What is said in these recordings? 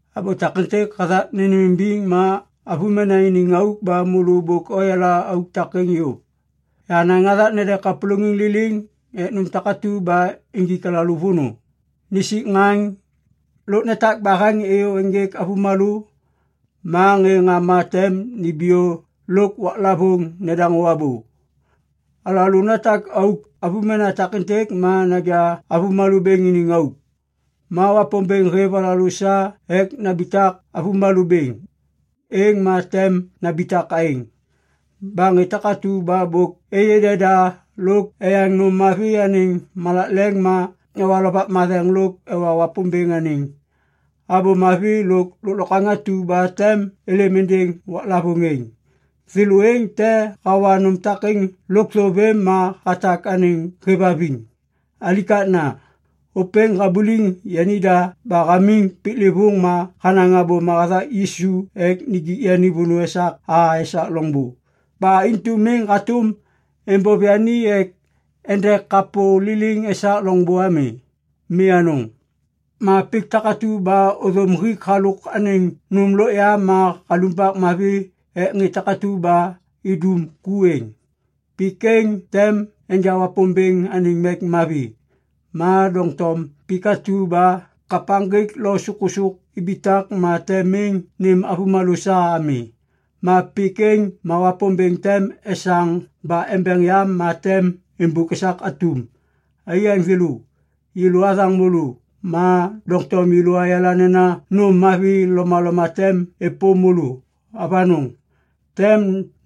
Abô takêntêk hathak nênêmimbiŋ ma avômena iniŋ auk ba môlô bôk oyala auk takêŋ yôv. Yahanaŋ hathak nede kapôlôŋiŋ liliŋ ek nôm takatu ba injik alalô vônô, nisik ŋaŋ, lôk netak baheŋ êyô ênjêk avômalô, ma ŋê ŋama tem nimbiyô lôk waklavôŋ nedaŋô abô. Alalô natak auk avômena takêntêk ma naja avômalô bêŋ iniŋ auk. Ma Wapômbêŋ hêv alalô sa ek nambitak avômalô bêŋ, êŋ ma tem nambitak aêŋ. Ba ŋê takatu ba bôk êyê deda lôk eyaŋ nôm mavi anêŋ malak leŋ ma ewa Lovak Matheŋ lôk ewa Wapômbêŋ anêŋ Abô Mavi lôk lôklokwaŋ atu ba tem êlêm êndêŋ waklavôŋ êŋ, thêlô êŋ te hawa nôm takêŋ lôkthô vêm ma hatak anêŋ hêvhaviŋ. Alikakna! Ôpêŋ habuliŋ yanida ba hamiŋ piklêvôŋ ma hanaŋ abôma hathak Yisu ek nijik yani vônô esak a esak loŋbô. Ba intu miŋ hatôm êmbôv yani ek ende kapô liliŋ esak loŋbô ami. Mi anôŋ! Ma pik takatu ba ôthôm hik halôk anêŋ nôm lôk ya ma halumbak mavi ek ŋê takatu ba idum ku êŋ, pik êŋ tem enja Wapômbêŋ anêŋ mek mavi. Ma doŋtom pik atu ba kapaŋgik lôk sôkôsôk ibitak ma tem miŋ nêm avômalô sa ami. Ma pik êŋ ma Wapômbêŋ tem esaŋ ba embeŋ yam ma tem êmbôk esak atum. Aiyaŋ thêlô, yêlô athaŋ môlô. Ma doŋtom yêlô ayala nena nôm mavi lomaloma tem êpôm môlô. Avanôŋ! Tem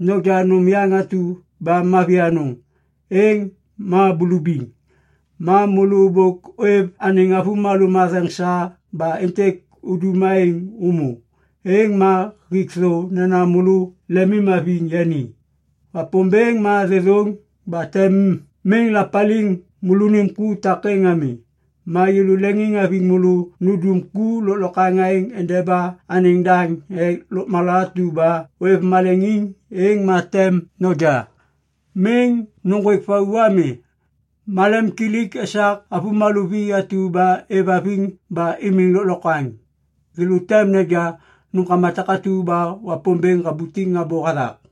noja nôm yaŋ atu ba mavi anôŋ, êŋ ma bulubiŋ. Ma môlô bôk ôêv anêŋ avômalô matheŋ sa ba êntêk udum aêŋ ômô. Êŋ ma hik thô nena môlô lemimhaviŋ yani. Wapômbêŋ ma thêthôŋ ba tem miŋ lapaliŋ môlônim ku takêŋ ami. Ma yêlô leŋiŋhaviŋ môlô nundum ku lôklokwaŋ aêŋ endeba anêŋ daŋ ek lôkmala atu ba ôêv malemim êŋ ma tem noja. Miŋ nôŋgwêk vau ami. Malemkilik esak avômalô vi atu ba êvhaviŋ ba imiŋ lôklokwaŋ. Thêlô tem neja nômkama takatu ba Wapômbêŋ habutiŋ abô hathak.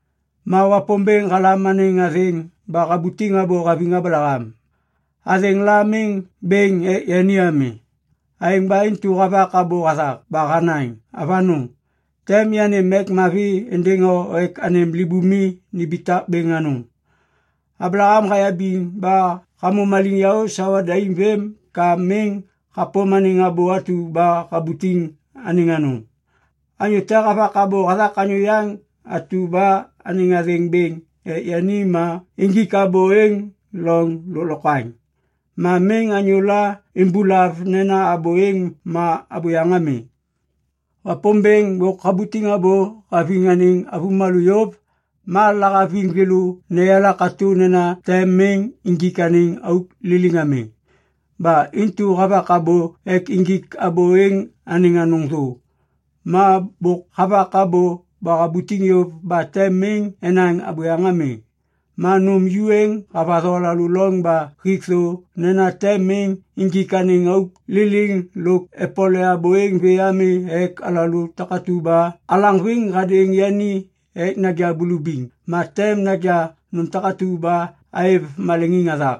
Ma Wapômbêŋ halam anêŋ athêŋ ba habutiŋ abô haviŋ Ablaham. Athêŋ la miŋ bêŋ ek yani ami. Aêŋ ba intu havak abô hathak ba hanaŋ, “Avanôŋ! Tem yanêm mek mavi êndêŋ o ek anêm libumi nimbitak bêŋ anôŋ.” Ablaham hayabiŋ ba hamô maliŋyaô sawa daim vêm ka miŋ hapôm anêŋ abô atu ba habutiŋ anêŋ anôŋ. Anyô te havak abô hathak anyô yaŋ atu ba anêŋ athêŋ bêŋ ek yani ma injik abô êŋ loŋ lôklokwaŋ. Ma miŋ anyôla imbulav nena abô êŋ ma abôyaŋ ami. Wapômbêŋ bôk habutiŋ abô haviŋ anêŋ avômalô yôv. Ma lahaviŋ thêlô neyala katô nena tem miŋ injik anêŋ auk liliŋ ami. Ba intu havak abô ek injik abô êŋ anêŋ anôŋ thô. Ma bôk havak abô ba habutiŋ yôv ba tem miŋ enaŋ abôyaŋ ami. Ma nôm ju êŋ havatho alalô loŋ ba hik thô nena tem miŋ injik anêŋ auk liliŋ lôk epole abô êŋ vê ami ek alalô takatu ba alaŋviŋ hadêŋ yani ek naja bulubiŋ ma tem naja nôm takatu ba aêv maleŋiŋ hathak.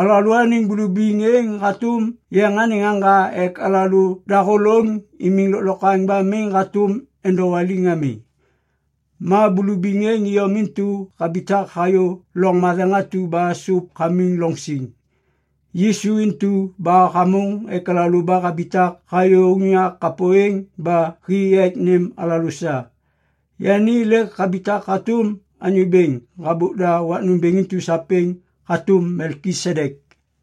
Alalôaniŋ bulubiŋ êŋ hatôm yeŋ anêŋ aŋga ek alalô dahôlôŋ imiŋ lôklokwaŋ ba miŋ hatôm endowaliŋ ami. Ma bulubiŋ êŋ iyom intu habitak hayô loŋ matheŋ atu ba sôp hamiŋ loŋ siŋ. Yisu intu ba hamôŋ ek alalô ba habitak hayô unyak kapô êŋ ba hi ek nêm alalô sa. Yani lêk habitak hatôm anyô bêŋ habôk da wak nômbêŋ intu sapêŋ hatôm Melkisedek.